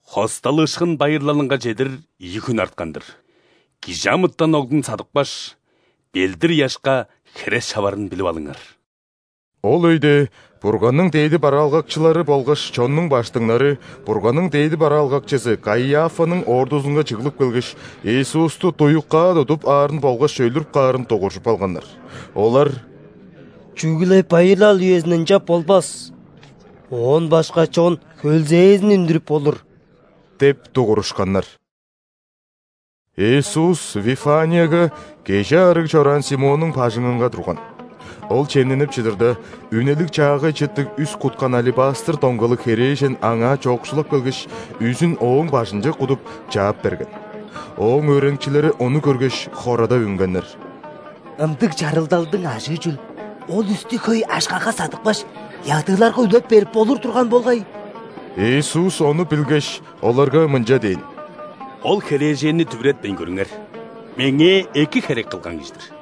«·Хосталыышкын байырлалынга чедир ийи хүн арткан-дыр, ·Кижи амытан Оглун садыпкаш, ·белдир-ыяшка хере шаварын билип алыңар». Ол өйде Бурганның дээди бараалгакчылары болгаш чоннуң ·баштыңнары Бурганның дээди бараалгакчызы Каиафаның ордузунга чыглып келгеш, Иисусту дуюкаа тудуп аарын болгаш өлүрүп каарын дугуржуп алганнар. Олар: «Чүгле байырлал үезинде ынчап болбас. Оон башка чон хөлзээзин үндүрүп болур» – деп дугурушканнар. Иисус Вифанияга, кежи аарыг чораан Симоннуң бажыңынга турган. Ол чемненип чыдырда, үнелиг чаагай чыттыг үс куткан алебастр доңгалыг херээжен Аңаа чоокшулап келгеш, үзүн Ооң бажынче кудуп, чаап берген. Ооң өөреникчилери ону көргеш, хорадап үнгеннер: «Ындыг чарыгдалдың ажыы чүл? Ол үстү хөй акшага садыпкаш, ядыыларга үлеп берип болур турган болгай!» Иисус ону билгеш, оларга мынча дээн: «Ол херээженни дүвүретпейн көрүңер, Меңээ эки херек кылган кижи-дир!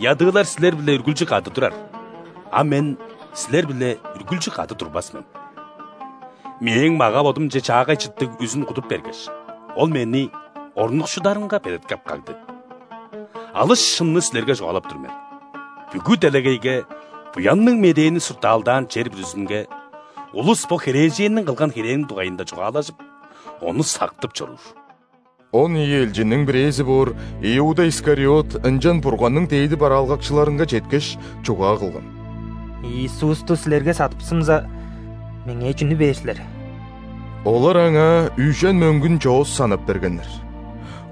Ядыылар силер-биле үргүлчү кады турар, а Мен силер-биле үргүлчү кады турбас мен. Мээң мага-бодумче чаагай чыттыг үзүн кудуп бергеш, ол Мени орнукшударынга белеткеп кагды. Алыс шынны силерге чугаалап тур мен: бүгү делегейге, Буянныг Медээни суртаалдаан чер бүрүзүнге, улус бо херээженниң кылган херээниң дугайында чугаалажып, ону сактып чоруур». Он ийи элчинниң бирээзи боор Иуда Искариот ынчан Бурганның дээди бараалгакчыларынга четкеш, чугаа кылган: «Иисусту силерге садыпсымза, меңээ чүнү бээр силер?» Олар аңаа үжен мөңгүн чоос санап бергеннер.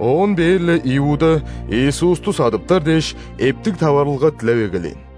Оон бээр-ле Иуда, Иисусту садыптар дээш, эптиг таварылга дилеп эгелээн.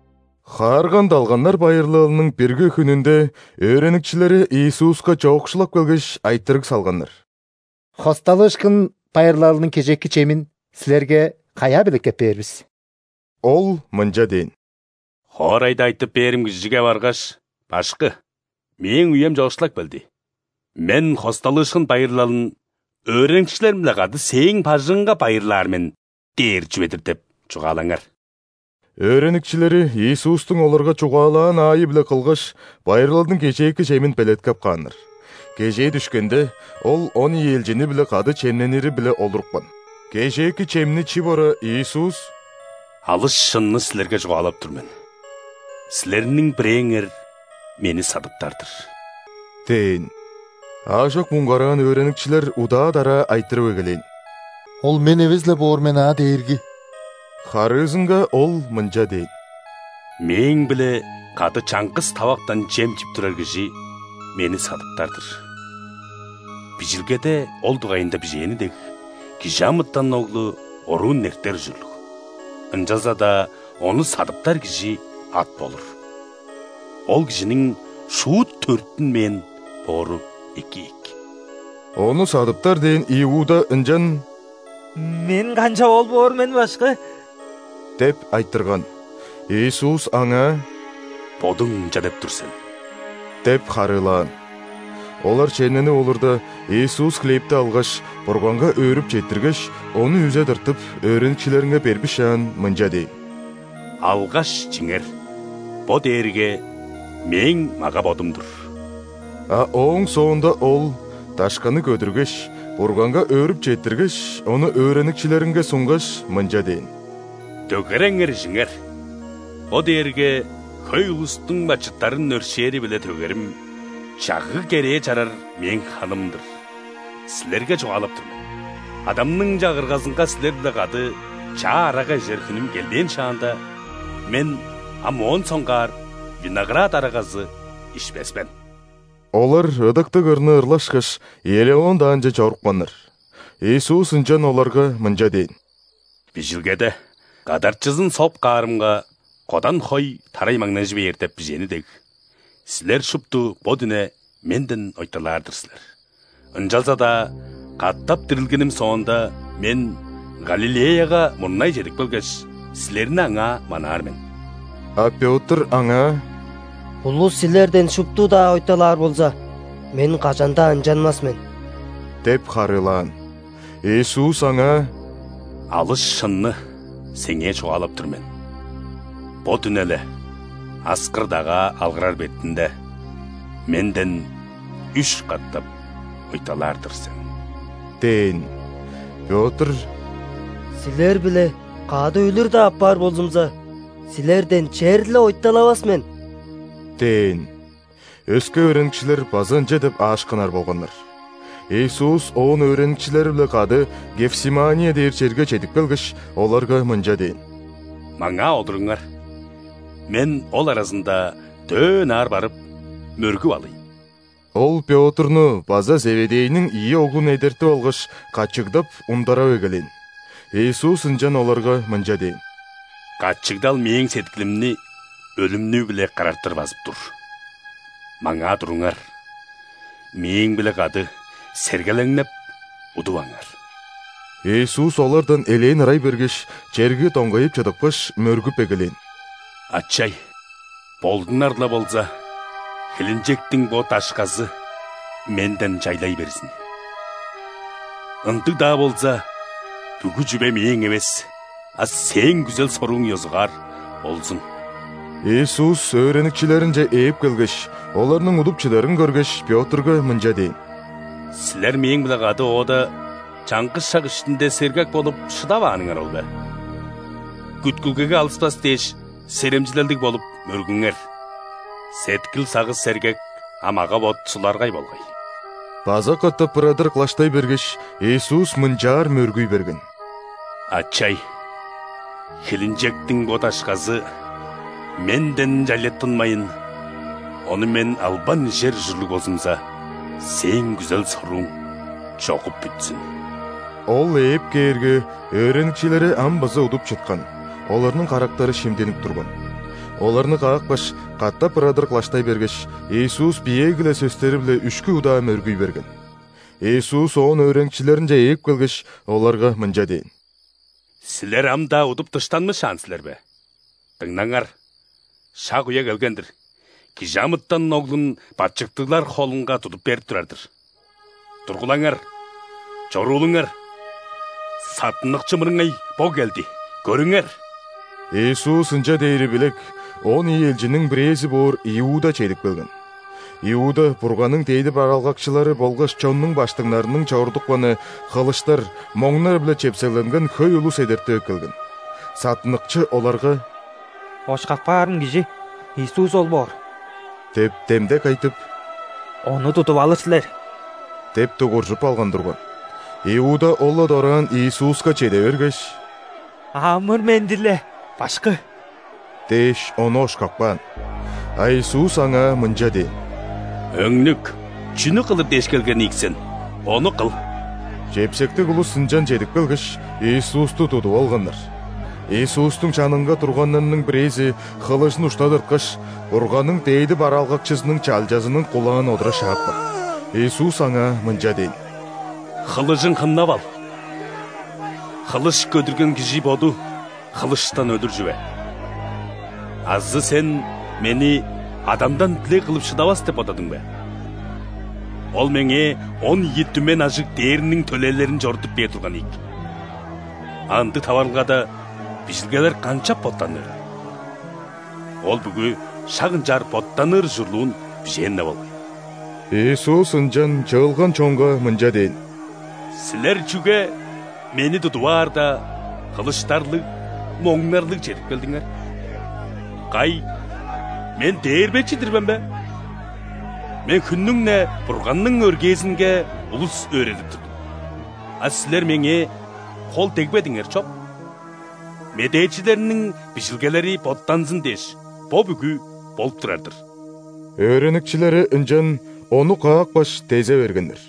·Хаарган далганнар байырлалының бирги хүнүнде өөреникчилери Иисуска чоокшулап келгеш, айтырыг салганнар: «·Хосталыышкын байырлалының кежээки чемин Силерге каяа белеткеп бээр бис?» Ол мынча дээн: «Хоорайда айтып бээрим кижиге баргаш: „Башкы: ‘Мээң үем чоокшулап келди. Мен Хосталыышкын байырлалын өөреникчилерим-биле кады сээң бажыңыңга байырлаар мен’ – дээр чүве-дир“ – деп чугаалаңар». Өөреникчилери Иисустуң оларга чугаалаан аайы-биле кылгаш, байырлалдың кежээки чемин белеткеп кааннар. Кежээ дүшкенде, Ол он ийи элчини-биле кады чемненири-биле олурупкан. Кежээки чемни чип ора, Иисус: «Алыс шынны силерге чугаалап тур мен: силерниң бирээңер Мени садыптар-дыр» – дээн. Аажок муңгараан өөреникчилер удаа-дараа айтырып эгелээн: «Ол мен эвес-ле боор мен аа, Дээрги?» Харыызынга Ол мынча дээн: «Мээң-биле кады чаңгыс тавактан чем чип турар кижи Мени садыптар-дыр! Бижилгеде ол дугайында бижээни дег, ·Кижи амытан Оглу оруун эртер ужурлуг, ынчалза-даа Ону садыптар кижи ат болур! Ол кижиниң шуут төрүттүнмээн боору эки ийик!» Ону садыптар дээн Иуда ынчан: «Мен канчап ол боор мен, Башкы?» – деп айтырган. Иисус аңаа: «Бодуң ынча деп тур сен» – деп харыылаан. Олар чемненип олурда, Иисус хлебти алгаш, Бурганга өөрүп четтиргеш, ону үзе тыртып, өөреникчилеринге бербишаан, мынча дээн: «Алгаш, чиңер, бо дээрге Мээң мага-бодум-дур». А ооң соонда Ол дашканы көдүргеш, Бурганга өөрүп четтиргеш, ону өөреникчилеринге сунгаш, мынча дээн: «Дөгереңер ижиңер, бо дээрге хөй улустуң бачыттарын өршээри-биле төгерим, чагыг-керээ чарар Мээң ханым-дыр. Силерге чугаалап тур мен: Адамның Чагыргазынга силер-биле кады чаа арага ижер хүнүм келбээн шаанда, Мен ам моон соңгаар виноград арагазы ишпес мен». Олар ыдыктыг ырны ырлашкаш, Елеон даанче чорупканнар. Иисус ынчан оларга мынча дээн: «Бижилгеде: „Кадарчызын соп каарымга, кодан хой тарай маңнажы бээр“ – деп бижээни дег, силер шупту бо дүне Менден ойталаар-дыр силер. Ынчалза-даа катап дирилгеним соонда, Мен Галилеяга мурнай чедип келгеш, силерни аңаа манаар мен». А Пётр Аңаа: «Улус Силерден шупту-даа ойталаар болза, мен кажан-даа ынчанмас мен!» – деп харыылаан. Иисус аңаа: «Алыс шынны сеңээ чугаалап тур мен: бо дүне-ле, аскыр-дагаа алгырар бетинде, Менден үш катап ойталаар-дыр сен» – дээн. Пётр: «Силер-биле кады өлүр-даа апаар болзумза, Силерден черле ойталавас мен!» – дээн. Өске өөреникчилер база ынча деп аашкынар болганнар. Иисус оон өөреникчилери-биле кады Гефсимания дээр черге чедип келгеш, оларга мынча дээн: «Маңаа олуруңар, Мен ол аразында дөө ынаар барып, мөргүп алыйн». Ол Пётрну база Зеведейниң ийи оглун эдертип алгаш, качыгдап, ундарап эгелээн. Иисус ынчан оларга мынча дээн: «Качыгдал мээң сеткилимни өлүмнүү-биле карартыр базып тур. Маңаа туруңар, Мээң-биле кады сергелеңнеп, удуваңар». Иисус олардан элээн ырай бергеш, черге доңгайып чыдыпкаш, мөргүп эгелээн: «Ачай! Болдунар-ла болза, хилинчектиң бо дашказы Менден чайлай берзин! Ындыг-даа болза, бүгү чүве Мээң эвес, а Сээң күзел-сорууң ёзугаар болзун». Иисус өөреникчилеринче ээп келгеш, оларның удуп чыдарын көргеш, Пётрга мынча дээн: «Силер Мээң-биле кады оода чаңгыс шак иштинде сергек болуп шыдавааныңар ол бе? Күткүлгеге алыспас дээш, серемчилелдиг болуп, мөргүңер. Сеткил-сагыш – сергек, а мага-бот – суларгай болгай». База катап ырадыр кылаштай бергеш, Иисус мынчаар мөргүй берген: «Ачай! Хилинчектиң бо дашказы Менден чайлаттынмайн, ону Мен албан ижер ужурлуг болзумза, Сээң күзел-сорууң чогуп бүтсүн!» Ол ээп кээрге, өөреникчилери ам база удуп чыткан: оларның карактары шимдинип турган. Оларны каапкаш, катап ырадыр кылаштай бергеш, Иисус биеэги-ле сөстери-биле үшкү удаа мөргүй берген. Иисус оон өөреникчилеринче ээп келгеш, оларга мынча дээн: «Силер ам-даа удуп дыштанмышаан силер бе? Дыңнаңар, шак-үе келген-дир, Кижи амытан Оглун бачыттыглар холунга тудуп берип турар-дыр. Тургулаңар, чоруулуңар! Саттыныкчы мырыңай бо келди, көрүңер!» Иисус ынча дээри билек, он ийи элчинниң бирээзи боор Иуда чедип келген. Иуда Бурганның дээди бараалгакчылары болгаш чоннуң ·баштыңнарының чорудупканы, хылыштар, моңнар-биле чепсегленген хөй улус эдертип эккелген. Саттыныкчы оларга: «Ошкап каарым кижи Иисус ол боор – деп демдек айтып, – Ону тудуп алыр силер» – деп дугуржуп алган турган. Иуда ол-ла дораан Иисуска чеде бергеш: «Амыр-менди-ле, Башкы!» – дээш, Ону ошкап каан. А Иисус аңаа мынча дээн: «Өңнүк, чүнү кылыр дээш келген ийик сен, ону кыл». Чепсектиг улус ынчан чедип келгеш, Иисусту тудуп алганнар. Иисустуң чанынга турганнарның бирээзи хылыжын ушта тырткаш, Бурганның дээди бараалгакчызының чалчазының кулаан одура шаапкан. Иисус аңаа мынча дээн: «Хылыжың хыннап ал! Хылыш көдүрген кижи боду хылыштан өлүр чүве. Азы сен Мени Адамдан дилег кылып шыдавас деп бодадың бе? Ол Меңээ он ийи түмен ажыг ·дээрниң төлээлерин чорудуп бээр турган ийик! А ындыг таварылгада Бижилгелер канчап боттанырыл? Ол бүгү шак ынчаар боттаныр ужурлуун бижээн-не болгай!» Иисус ынчан чыылган чонга мынча дээн: «Силер чүге Мени тудуп аарда, хылыштарлыг, моңнарлыг чедип келдиңер? Кай, Мен дээрбечи-дир мен бе? Мен хүннүң-не Бурганның өргээзинге улус өөредип турдум, а силер Меңээ хол дегбедиңер чоп. Медээчилерниң бижилгелери боттанзын дээш, бо бүгү болуп турар-дыр». Өөреникчилери ынчан Ону каапкаш, дезе бергеннер.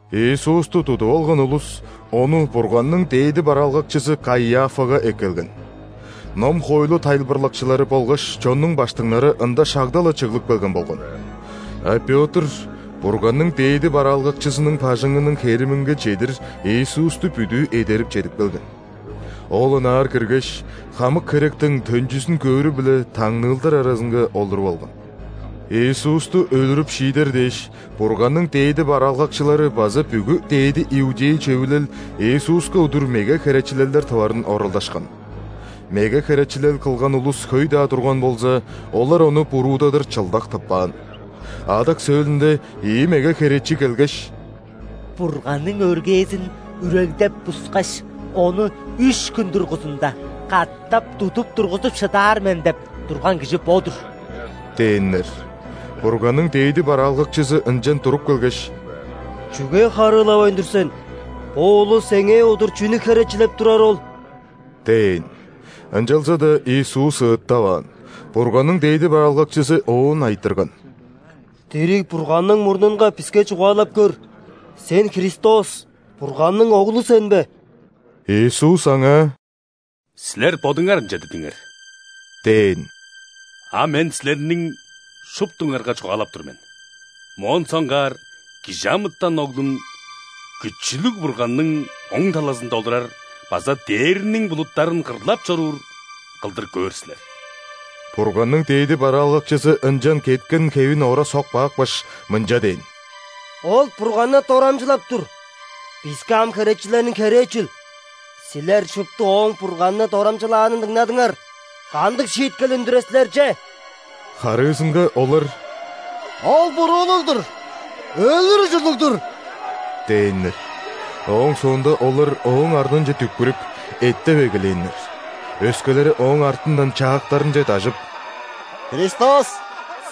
Иисусту тудуп алган улус Ону Бурганның дээди бараалгакчызы Каиафага эккелген. Ном-хоойлу тайылбырлакчылары болгаш чоннуң ·баштыңнары ында шагда-ла чыглып келген болган. (А Пётр Бурганның дээди бараалгакчызының бажыңының хериминге чедир Иисусту бүдүү эдерип чедип келген. Ол ынаар киргеш, хамык херектиң төнчүзүн көөрү-биле таңныылдар аразынга олуруп алган.) Иисусту өлүрүп шиидер дээш, Бурганның дээди бараалгакчылары база бүгү ·дээди иудей Чөвүлел Иисуска удур меге херечилелдер тыварын оралдашкан. Меге херечилел кылган улус хөй-даа турган болза, олар Ону буруудадыр чылдак тыппаан. Адак сөөлүнде ийи меге херечи келгеш: «„Бурганның өргээзин үрегдеп-бускаш, ону үш хүн дургузунда катап тудуп тургузуп шыдаар мен“ – деп турган кижи бо-дур» – дээннер. Бурганның дээди бараалгакчызы ынчан туруп келгеш: «Чүге харыылавайн тур сен? Бо улус сеңээ удур чүнү херечилеп турары ол?» – дээн. Ынчалза-даа Иисус ыыттаваан. Бурганның дээди бараалгакчызы Оон айтырган: «Дириг Бурганның мурнунга биске чугаалап көр, Сен – Христос, Бурганның Оглу сен бе?» Иисус аңаа: «Силер бодуңар ынча дидиңер – дээн. – А Мен силерниң шуптуңарга чугаалап тур мен: моон соңгаар ·Кижи амытан Оглун Күчүлүг Бурганның оң талазында олурар база дээрниң булуттарын кырлап чоруур кылдыр көөр силер». Бурганның дээди бараалгакчызы ынчан кеткен хевин ора соп каапкаш, мынча дээн: «Ол Бурганны дорамчылап тур! Биске ам херечилерниң херээ чүл? Силер шупту Ооң Бурганны дорамчылаанын дыңнадыңар! Кандыг шииткел үндүрер силер че?» Харыызынга олар: «Ол буруулуг-дур, өлүр ужурлуг-дур!» – дээннер. Ооң соонда олар Ооң арнынче дүкпүрүп, эттеп эгелээннер. Өскелери Ооң артындан чаактарынче дажып: «Христос,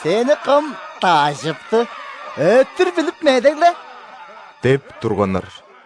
Сени кым дажыпты? Өттүр билип медегле!» – деп турганнар.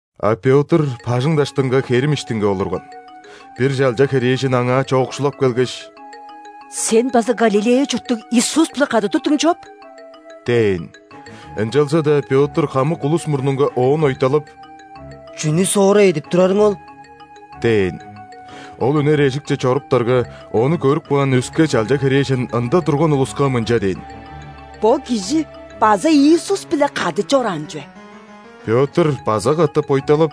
А Пётр бажың даштынга херим иштинге олурган. Бир чалча херээжен аңаа чоокшулап келгеш: «Сен база Галилея чурттуг Иисус-биле кады турдуң чоп» – дээн. Ынчалза-даа Пётр хамык улус мурнунга оон ойталап: «Чүнү соора эдип турарың ол?» – дээн. Ол үнер эжикче чоруптарга, ону көрүп каан өске чалча херээжен ында турган улуска мынча дээн: «Бо кижи база Иисус-биле кады чораан чүве». Пётр база катап ойталап: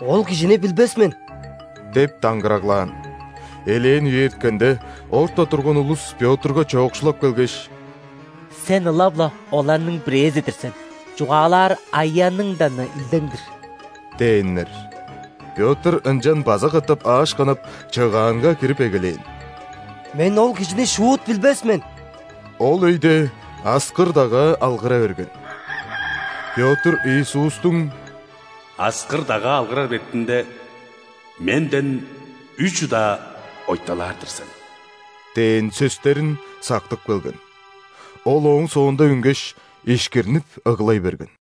«Ол Кижини билбес мен» – деп даңгыраглаан. Элээн үе эрткенде, орта турган улус Пётрга чоокшулап келгеш: «Сен ылап-ла оларның бирээзи-дир сен, чугаалаар аяныңдан-на илдең-дир» – дээннер. Пётр ынчан база катап аашкынып, чыгаанга кирип эгелээн: «Мен ол Кижини шуут билбес мен!» Ол өйде аскыр-дагаа алгыра берген. Пётр Иисустуң: «Аскыр-дагаа алгырар бетинде, Менден үш удаа ойталаар-дыр сен» – дээн сөстерин сактып келген. Ол ооң соонда үнгеш, ишкирнип ыглай берген.